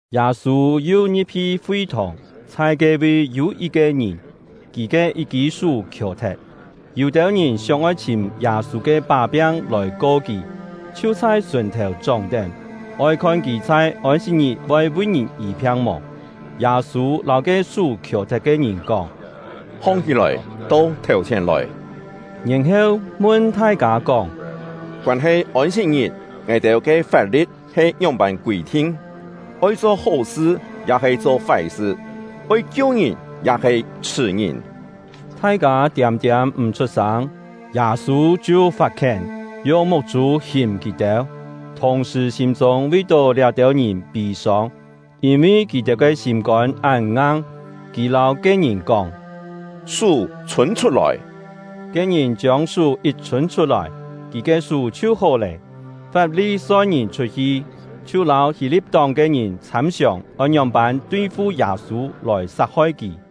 Yâ-sû yu ngi̍p-hi fi-thòng; chhai ke-vi yû yit-ke ngìn, kì ke yit-kî sú khiò-thet. Yû-têu ngìn sióng-oi chhìm Yâ-sû ke pá-piang lòi ko kì, chhiu chhai sùn-thèu chóng-tén, oi khon kì chhai Ôn-sit-ngit voi vi ngìn yî-phiang mò. Yâ-sû lâu ke sú khiò-thet ke ngìn kóng: “Hong-hí-lòi, to thèu-chhièn lòi.” Yèn-heu, mun thai-kâ kóng: “Koân-he Ôn-sit-ngit, ngài-têu ke fap-li̍t he ngióng-pân kûi-thin? Oi cho hó-sṳ, ya-he cho fái-sṳ? Oi kiu ngìn, ya-he chhṳ̀ ngìn?” Thai-kâ tiâm-tiâm m̀ chhut-sâng. Yâ-sû chhiu fat-khién, yung muk-chû hìm kì-têu, thùng-sṳ̀ sîm-chûng vi-tó liá-têu ngìn pî-sông, yîn-vi kì-têu ke sîm-kôn án ngang. Kì lâu ke-ngìn kóng: “Sú chhûn chhut-lòi!” Ke-ngìn chiông sú yit chhûn chhut-lòi, kì ke sú chhiu hó lé. Fap-li-soi-ngìn chhut-hi, chhiu lâu Hî-li̍t-tóng ke ngìn chhâm-siòng oi ngióng-pân tui-fu Yâ-sû lòi sat-hoi kì.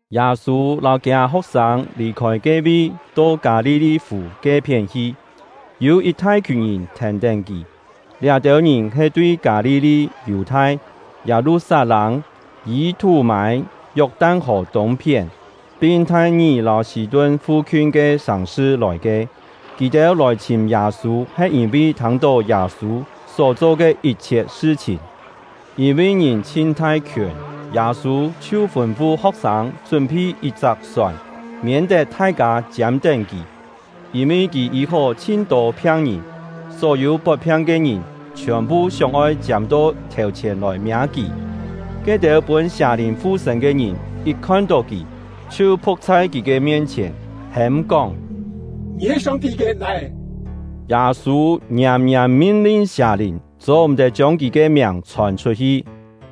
Yâ-sû lâu kiâ ho̍k-sâng lì-khôi ke-vi to Kâ-li-li-fù ke-phién hi, yû yit thai-khiùn ngìn thèn-tén kì. Liá-têu ngìn he tui Kâ-li-li, Yù-thai, Yâ-lu-sat-lâng, Yî-thú-mâi, Yok-tan-hò tûng-phién, pin Thai-ngì lâu Sî-tun fu-khiun ke sàng-sṳ lòi ke. Kì-têu lòi chhìm Yâ-sû he yîn-vi thâng-tó Yâ-sû só-cho ke yit-chhiet sṳ-chhìn. Yîn-vi ngìn chhin thai-khiùn, Yâ-sû chhiu fûn-fu ho̍k-sâng chún-phi yit-chak sòn, miên-tet thai-kâ chiâm-tén kì. Yîn-vi kì yî-hó chhin-tô phiang-ngìn, só-yû pot-phiang ke ngìn chhiòn-phu sióng-oi chiâm-to thèu-chhièn lòi miâ kì. Ke-têu pûn sià-lìn fu-sṳ̂n ke ngìn yit khon-tó kì, chhiu phu̍k chhai kì ke mien-chhièn, hêm-kóng: “Ngì he Song-ti ke Lai-é!” Yâ-sû ngiàm-ngiàm min-lin sià-lìn, cho-m̀-tet chiông kì ke miàng chhòn chhut-hi.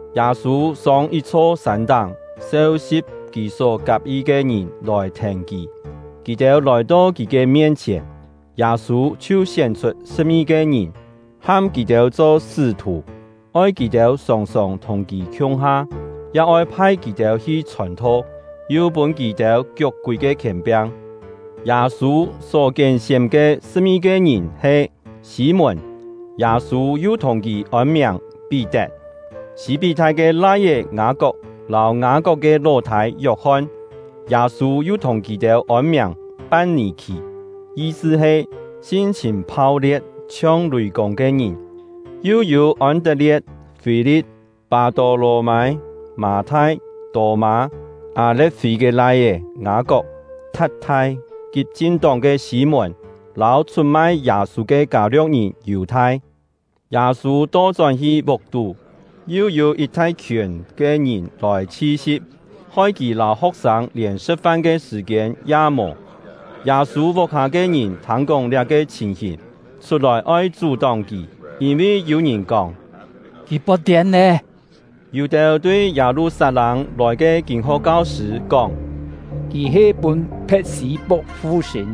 Yâ-sû sông yit-chho sân-táng, seu-si̍p kì só kak-yi ke ngìn lòi thèn kì. Kì-têu lòi-to kì ke mien-chhièn, Yâ-sû chhiu sién-chhut sṳ̍p-ngi-ke ngìn, ham kì-têu cho sṳ́-thù, oi kì-têu sòng-sòng thùng kì khiung-ha, ya oi phai kì-têu hi chhòn-tho, yu pûn kì-têu kiuk-kúi ke khièn-piang. Yâ-sû só kién-sién ke sṳ̍p-ngi-ke ngìn he: Sî-mùn (Yâ-sû yu thùng kì ôn-miàng Pí-tet), Sî-pí-thai ke lai-é Ngâ-kok lâu Ngâ-kok ke ló-thâi Yok-hon (Yâ-sû yu thùng kì-têu ôn-miàng Pan-nì-khì, yi-sṳ he “sin-chhìn phau-lie̍t, chhiong lùi-kûng ke ngìn”), yu yû Ôn-tet-lie̍t, Fî-li̍t, Pâ-tô-lò-mâi, Mâ-thai, Tô-mâ, Â-le̍t-fî ke lai-é Ngâ-kok, Tha̍t-thai, Kit-chin-tóng ke Sî-mùn, lâu chhut-mai Yâ-sû ke Kâ-lio̍k-ngìn Yù-thai. Yâ-sû to-chón-hi vuk-tú; yu yû yit thai-khiùn ke ngìn lòi chhi-si̍p, hoi kì lâu ho̍k-sâng lièn sṳ̍t-fan ke sṳ̀-kiên ya mò. Yâ-sû vuk-hâ ke ngìn thâng-kóng liá-ke chhìn-hìn, chhut-lòi oi chú-tóng kì, yîn-vi yû-ngìn kóng: “Kì pot-tiên lé!” Yû-têu tui Yâ-lu-sat-lâng lòi ke kîn-ho̍k kau-sṳ̂ kóng: “Kì he pûn Phe̍t-sî-puk fu-sṳ̂n!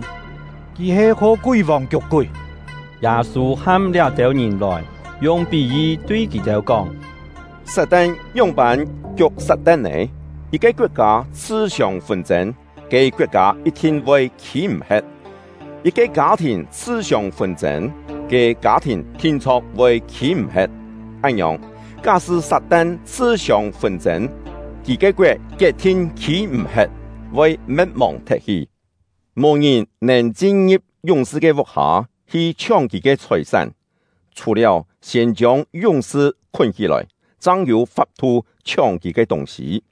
Kì he kho kúi-vòng kiuk-kúi!” Yâ-sû ham liá-têu ngìn lòi, yung pí-yi tui kì-têu kóng: “Sat-tan ngióng-voi kiuk Sat-tan nè? Yit-ke koet-kâ chhṳ-siông fûn-chên, ke koet-kâ yit-thin voi khî-m̀-he̍t. Yit-ke kâ-thìn chhṳ-siông fûn-chên, ke kâ-thìn thin-chho̍k voi khî-m̀-he̍t. Án-ngiòng, ká-sṳ́ Sat-tan chhṳ-siông fûn-chên, kì ke koet kiet-thin khî-m̀-he̍t, voi me̍t-mòng thet-hi. “Mò ngìn nèn chin-ngi̍p yúng-sṳ ke vuk-hâ hi chhióng kì ke chhòi-sán; chhù-liáu siên chiông yúng-sṳ khún hí-lòi, chang yû fap-thu chhióng kì ke tûng-sî.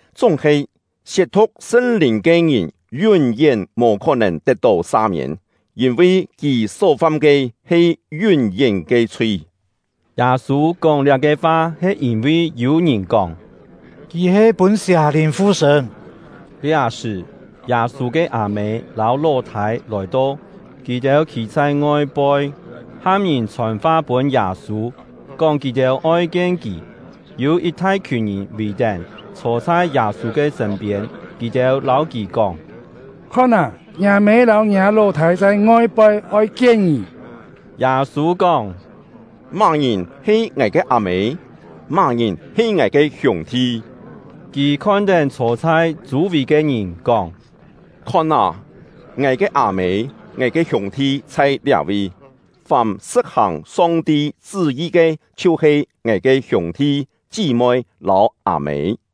chúng-he siet-thu̍k Sṳn-Lìn ke ngìn yún-yén mò khó-nèn tet-tó sa-miên, yîn-vi kì só fam ke he yún-yén ke chhui.” (Yâ-sû kóng liá-ke fa he yîn-vi yû-ngìn kóng: “Kì he pûn sià-lìn fu-sṳ̂n.”) Liá-sṳ̀, Yâ-sû ke â-mê lâu ló-thâi lòi-to; kì-têu khî chhai ngoi-poi, ham ngìn chhòn-fa pûn Yâ-sû, kóng kì-têu oi kien kì. Yû yit thai-khiùn ngìn vì-tén, chhô chhai Yâ-sû ke sṳ̂n-piên; kì-têu lâu kì kóng: “Khon â, ngiâ mê lâu ngiâ ló-thâi chhai ngoi-poi, oi kien ngì!” Yâ-sû kóng: “Má-ngìn he ngài ke â-mê? Má-ngìn he ngài ke hiûng-thi?” Kì khon-tén chhô chhai chû-vì ke ngìn, kóng: “Khon â, ngài ke â-mê, ngài ke hiûng-thi chhai liá-vi! Fàm sṳ̍t-hàng Song-ti chṳ́-yi ke chhiu-he ngài ke hiûng-thi, chí-moi, lâu â-mê.”